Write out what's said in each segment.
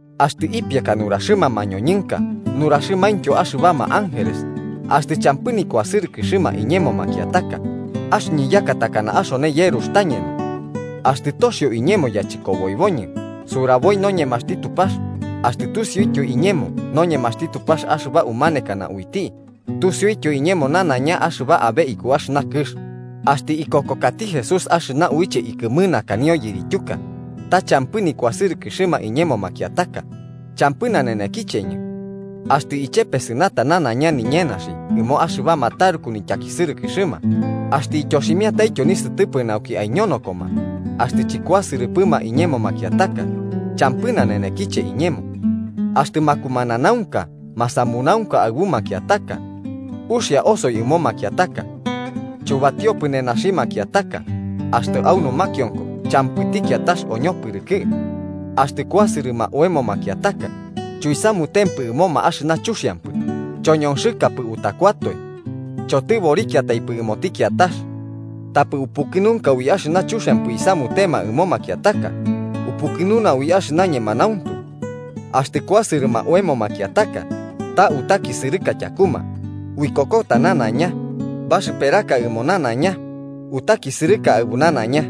Axtɨ ipiaka nuraxɨma mañoñɨnka nuraxɨmaintyo axɨbama ángeles, axtɨ champɨ nikuasɨrɨkɨxɨma iñemo makiataka, axɨñɨ yaka takana axone yerux tañeno. Axtɨ toxio iñemo yachɨkoboiboñɨ suraboi noñemaxti Tupax, axtɨ tusiuityo iñemo noñemaxti Tupax axɨba umanekana uiti, tusiuityo iñemo nanaiña axɨba abe iku axɨna kɨx, axtɨ ikokokati Jesús axɨna uiche ikɨmɨnakanio yirityuka, ta champɨ nikuasɨrɨkɨxɨma iñemo makiataka, champɨ nanenekicheñɨ. Axtɨ ichepesɨnata nanaiña niñenaxi ɨmo axɨbama taruku nityakisɨrɨkɨxɨma, axtɨ ityoximiataityo nisɨtɨpɨ nauki aiñonokoma, axtɨ chɨkuasɨrɨpɨma iñemo makiataka, champɨ nanenekiche iñemo. Axtɨ makumananaunka masamunaunka aɨbu makiataka. Uxia osoi ɨmo makiataka. Chuyubatiopɨ nenaxi makiataka, axtɨ au numakionko champɨti kiatax oñopɨrɨkɨ. Axtɨ kuasɨrɨma oemo makiataka, chuisamutempɨ ɨmoma axɨma chuxiampɨ, choñonxɨkapɨ utakuatoe. Chotɨborikiataipɨ ɨmoti kiatax. Tapɨ upukɨnunka ui axɨna chuxiampɨ isamutema ɨmo makiataka, upukɨnuna ui axɨna ñemanauntu. Axtɨ kusɨrɨma oemo makiataka, ta utakisɨrɨka tyakuma, uikokota nanaiña, baxɨperaka ɨmo nanaiña, utakisɨrɨka aɨbu nanaiña.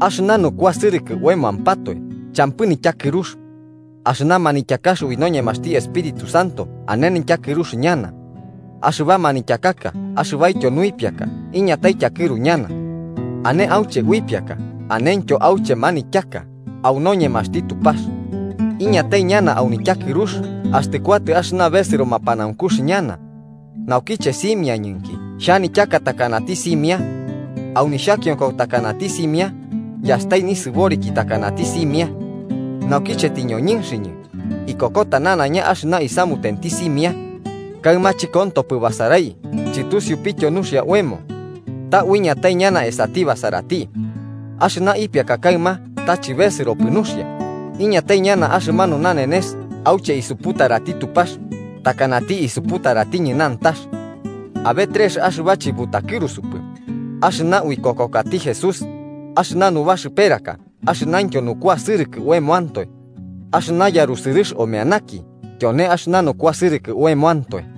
Axɨna nukuasɨrɨkɨ oemoampatoe champɨ nityakɨrux. Axɨna manityakax ui noñemaxti Espíritu Santo ane nityakɨrux ñana. Axɨba manityakaka axɨbaityo nuipiaka iñatai tyakɨru ñana. Ane auche uipiaka anentyo auche manityaka au noñemaxti Tupax. Iñatai ñana au nityakɨrux axtɨ kuatɨ axɨna besɨro mapanaunkux ñana. Naukiche simiañɨnki xhanityaka takanati simia. Au nixhakionko takanati simia, yastai nisɨboriki takanati simia. Naukiche tɨñoñɨnxɨñɨ, iñokota nanaiña axɨna isamutenti simia. Kaɨma chɨkontopɨ basarai chɨtusiupityo nuxia oemo. Ta uiñatai ñana esati basarati. Axɨna ipiaka kaɨma ta chɨbesɨropɨ nuxia, iñatai ñana axɨmanu nanenes auche isuputarati Tupax takanati isuputaratiñɨ nantax. Abe trex axɨba chɨbutakɨrusupɨ: axɨna uikokokati Jesús, axɨna nubaxɨperaka axɨnaintyo nukuasɨrɨkɨ oemoantoe, axɨna yarusɨrɨx omeanaki tyone axɨna nukuasɨrɨkɨ oemoantoe.